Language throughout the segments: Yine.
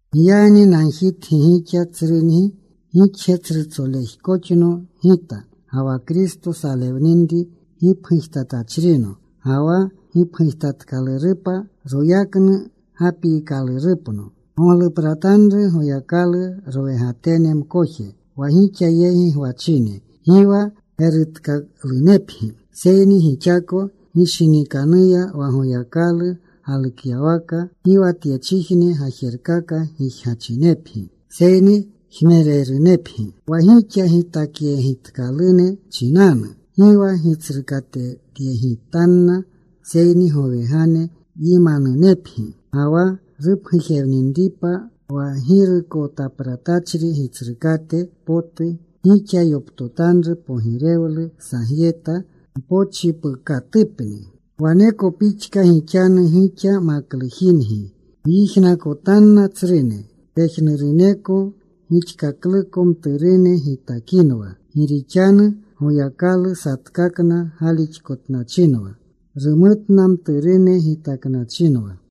Giyagni nagjitgi gixa tsrungi, gixje tsrutsolejkoxno gita ga wa Kristo salewninri gipgujtatachrino, ga wa gipgujetkalurupa royaknu gapiikalurupno. Goglupratanru Goyakalu rowegatene mkoje wa gixa yegi gwachine, gi wa gerutkalunepgi seyni gixako ginshinikanuya wa Goyakalu galukyawaka. Gi wa tyechijne gajerkaka gijgachinepgi, seyni jmererunepgi. Wa gixa gitakyegitkalune chinanu, gi wa gitsrukatetyegitanna, seyni gowegane yimanunepgi. Ga wa rupgujewninipa wa Girukotapratachri Gitsrukate potu, gixa yoptotanru pogirewlu sagyeta mpochipukatupni. Waneko pixka gixanu gixa, maklujingi. Gyijnakotanna tsrune. Pejnuruneko gixkakluko mturune gitakinwa. Gi rixanu Goyakalu satkakna galixkotnachinwa. Rumutna mturune gitaknachinwa.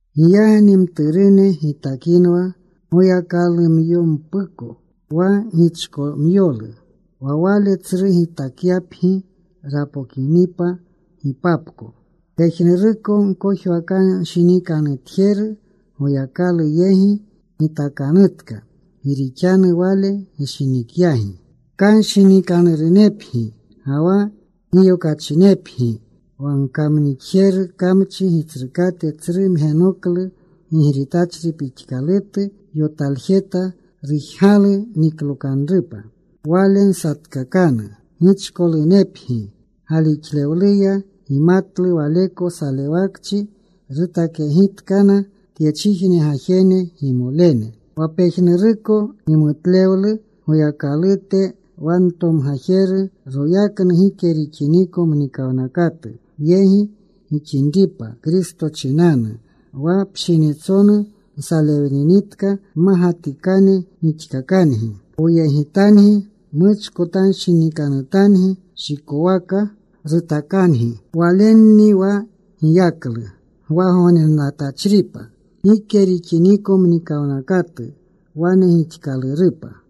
Giyagni mturune gitakinwa Goyakalumyompuko, wa gichkomyolu. Wa wale tsru gitakyapgi rapokinipa gipapko. Pejnuruko gkojwakanshinikanutjeru Goyakalu yegi gitakanutka, gi rixanu Wale gishinikyagi. Kanshinikanurunepgi, ga wa giyokachinepgi. Wa gkamnixjerni kamchi gitsrukate, tsru mgenoklu gigritachri pixkalutu yotaljeta. Rujgalu niklokanrupa. Wale nsatkakanu gichkolunepgi galixlewluya. Gimatlu waleko salewakchi rutakyegitkana tyechijne gajene gimolene. Wa pejnuruko gimutlewlu Goyakalute, wa ntomgajeru royaknu gike rixiniko mnikawnakatu yegi gixinripa Kristo chinanu, wa pshinitsonu nsalewninitka mmagatikane rixkakangi. Poyegitangi. Muchkotanshinikanutangi. Shikowaka rutakangi. Walenni wa giyaklu gwagognenatachripa gike rixiniko mnikawnakatu. Wane gixkalurupa.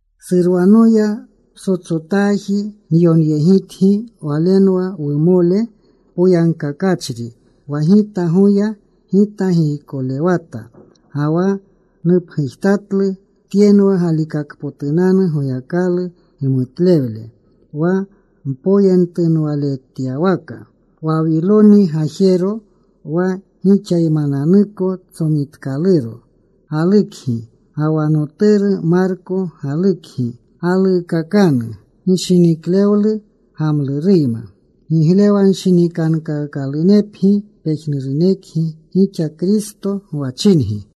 Surwanoya ptsotsotaaji nyonyegitgi. Walenwa wumole poyagkakachri wa gita goya. Gita giykolewata ga wa nupgujtatlu tyenwa galikakpotunanu Goyakalu gimutlewle wa mpoyentunwaletyawaka. Wawiloni gajero, wa gixaymananuko tsomitkaluro, galukgi. Ga wa noturu Marko galukgi. Galuukakanu gishiniklewlu gamluruyma. Giglewanshinikankaakalunepgi pejnurunekgi gixa Kristo gwachingi.